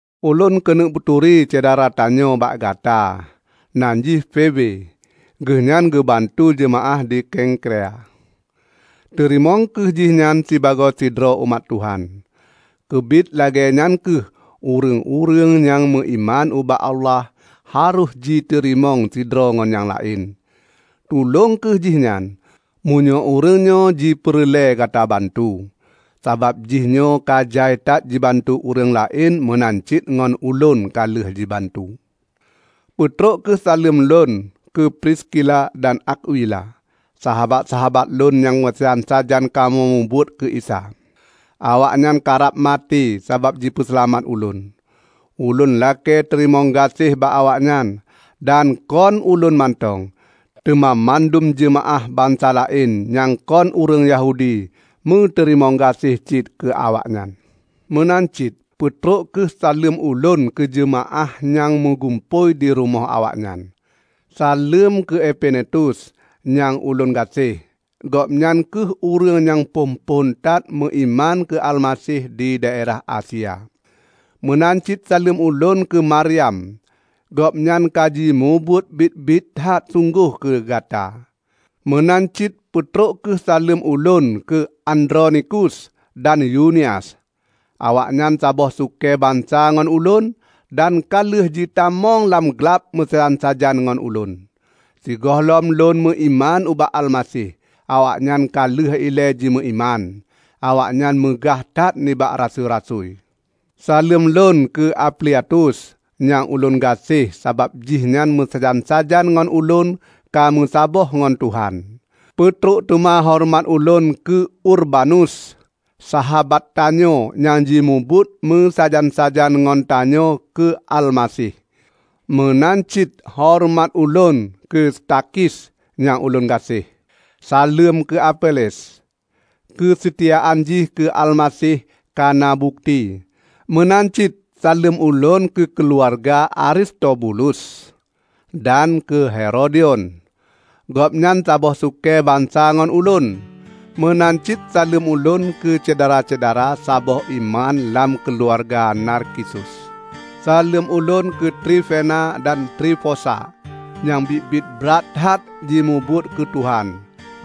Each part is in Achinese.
Ulôn keuneuk peuturi syedara tanyoe bak gata, nan jih Febe. Geuhnyan geubantu jeumaáh di Kengkrea. Teurimong kheueh jihnyan sibagoe sidroe umat Tuhan. Keubiet lagée nyan kheueh ureuëng-ureuëng nyang meuiman ubak Allah harôh jiteurimong sidroe ngon nyang laén. Tulông kheueh jihnyan, meunyoe ureuëngnyoe jipeureulée gata bantu, sabab jihnyoe ka jai that jibantu ureuëng laén meunan cit ngon ulôn ka lheueh jibantu. Peutrok kheueh saleuem ulôn keu Priskila dan Akwila, sahabat-sahabat lôn nyang meusajan-sajan kamoe mubuet keu Isa. Awaknyan karab maté sabab jipeuseulamat ulôn. Ulôn lakée teurimong gaséh bak awaknyan -- dan kon ulôn mantong, teuma mandum jeumaáh bansa laén nyang kon ureuëng Yahudi meuteurimong gaséh cit keuawaknyan. Meunan cit peutrok kheueh saleuem ulôn keujeumaáh nyang meugumpôi di rumoh awaknyan. Saleuem keu Epenetus nyang ulôn gaséh. Gobnyan kheueh ureuëng nyang phon-phon that meuiman keu Almaseh di daerah Asia. Meunan cit saleuem ulôn keu Maryam. Gobnyan ka jimubuet biet-biet that sunggoh keu gata. Meunan cit peutrok kheueh saleuem ulôn keu Andronikus dan Yunias. Awaknyan saboh sukée bansa ngon ulôn dan ka lheueh jitamong lam glab meusajan-sajan ngon lôn. Sigohlom lôn meuiman ubak Almaseh, awaknyan ka leubeh ilée jimeuiman. Awaknyan meugah that nibak rasui-rasui. Saleuem lon keu Ampliatus, nyang ulôn gaséh sabab jihnyan meusajan-sajan ngon ulôn ka meusaboh ngon Tuhan. Peutrok teuma horeumat ulôn keu Urbanus, sahabat tanyoe nyang jimubuet meusajan-sajan ngon tanyoe keu Almaseh. Meunan cit horeumat ulôn keu Stakhis nyang ulôn gaséh. Saleuem keu Apeles. Keuseutiaan jih keu Almaseh kana bukeuti. Meunan cit saleuem ulôn keu keuluwarga Aristobulus, dan keu Herodion. Gobnyan saboh sukée bansa ngon ulôn. Meunan cit saleuem ulôn keusyedara-syedara saboh iman lam keuluwarga Narkisus. Saleuem ulôn keu Trifena dan Trifosa nyang biet-biet brat that jimubuet keu Tuhan,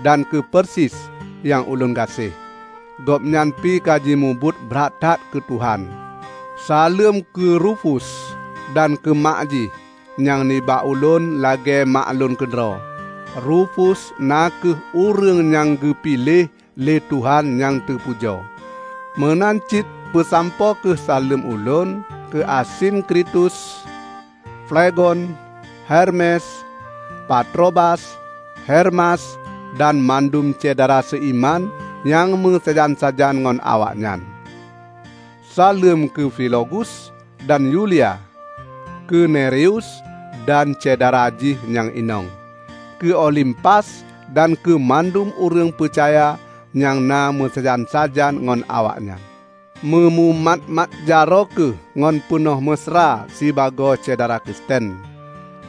dan keu Persis nyang ulôn gaséh. Gobnyan pi ka jimubuet brat that keu Tuhan. Saleuem keu Rufus dan keu mak jih, nyang nibak ulôn lagée mak lôn keudroe. Rufus na kheueh ureuëng nyang geupiléh lé Tuhan nyang teupujoe. Meunan cit peusampoe kheueh saleuem ulôn keu Asinkritus, Flegon, Hermes, Patrobas, Hermas, dan mandum syedara seuiman nyang meusajan-sajan ngon awaknyan. Saleuem keu Filologus dan Yulia; keu Nereus dan syedara jih nyang inong; keu Olimpas dan keumandum ureuëng peucaya nyang na meusajan-sajan ngon awaknyan. Meumumat-mat jaroe kheueh ngon peunoh meusra sibagoe syedara Kristen.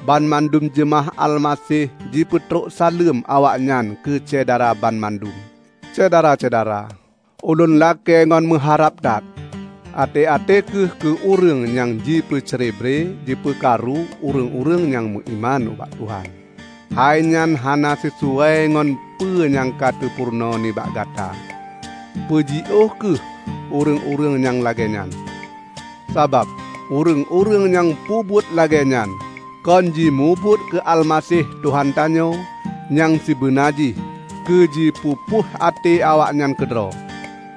Banmandum jeumaáh Almaseh jipeutrok saleuem awaknyan keu Syedara banmandum. Syedara-syedara! Ulôn lakée ngon meuharab that: Até-até kheueh keue ureuëng nyang jipeucrebre jipeukaru ureuëng-ureuëng nyang meuiman ubak Tuhan. Hainyan hana sisuai ngon peue nyang ka teupeurunoe nibak gata. Peujiôh kheueh ureuëng-ureuëng nyang lagée nyan. Sabab ureuëng-ureuëng nyang peubuet lagée nyan kon jimubuet keu Almaseh Tuhan tanyoe, nyang sibeuna jih keu jipeupuih até awaknyan keudroe.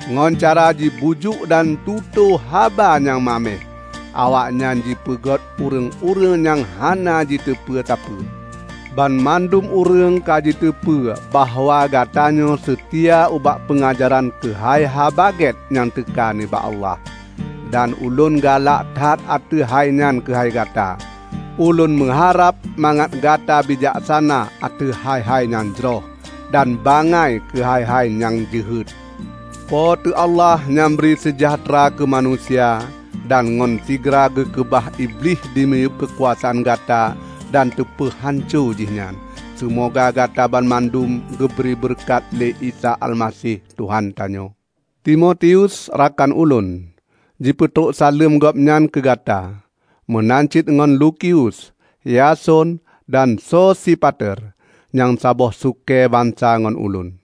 Ngon cara jibujuk dan tutoe haba nyang maméh, awaknyan jipeungét ureuëng-ureuëng nyang hana jiteupeu sapeue. Banmandum ureuëng ka jiteupeue bahwa gatanyoe seutia ubak peungajaran keuhai Haba Gét nyang teuka nibak Allah. Dan ulôn galak that ateueh hainyan keuhai gata. Ulôn meuharab mangat gata bijaksana ateueh hai-hai nyang jroh, dan bangai keuhai-hai nyang jeuhet. Po teu Allah nyang bri seujahteura keumanusia, dan ngon sigra geukeubah Iblih dimiyueb keukuasaan gata dan teupeuhanco jih nyan. Seumoga Gata banmandum geubri beureukat lé Isa Almaseh Tuhan tanyoe! Timotius, rakan ulôn, jipeutrok saleuem gobnyan keugata. Meunan cit ngon Lukius, Yason dan Sosipater, nyang saboh sukée bansa ngon ulôn.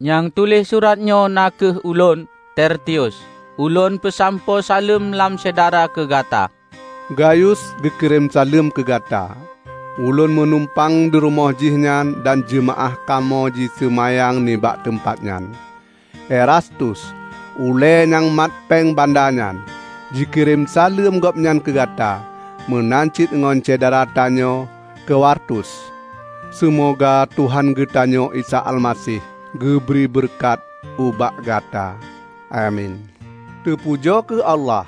Nyang tuléh suratnyoe na kheueh ulôn, Tertius. Ulôn peusampoe saleuem lam syedara keugata. Gayus geukirém saleuem keugata. Ulôn meunumpang dirumoh jihnyan dan jeumaáh kamoe jiseumayang nibak teumpat nyan. Erastus, ulée nyang mat péng banda nyan, jikirém saleuem gobnyan keugata. Meunan cit ngon syedara tanyoe Kwartus. Seumoga Tuhan geutanyoe Isa Almaseh geubri beureukat ubak Gata. Amin. Teupujoe kheueh Allah!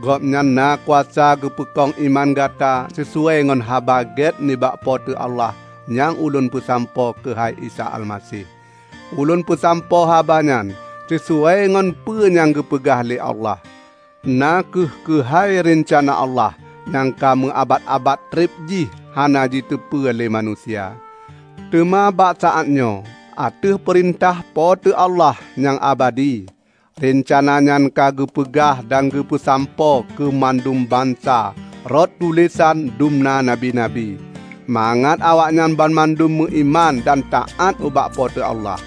Gobnyan na kuasa geupeukong iman Gata sisuai ngon Haba Gét nibak Po teu Allah nyang ulôn peusampoe keuhai Isa Almaseh. Ulôn peusampoe habanyan sisuai ngon peue nyang geupeugah lé Allah; na kheueh keuhai reuncana Allah nyang ka meuabat-abat treb jih hana jiteupeue lé manusia. Teuma bak saátnyoe, ateueh peurintah Po teu Allah nyang abadi, reuncana nyan ka geupeugah dan teupeusampoe keumandum bansa rot tulésan dumna nabi-nabi, mangat awaknyan banmandum meuiman dan taát ubak Po teu Allah.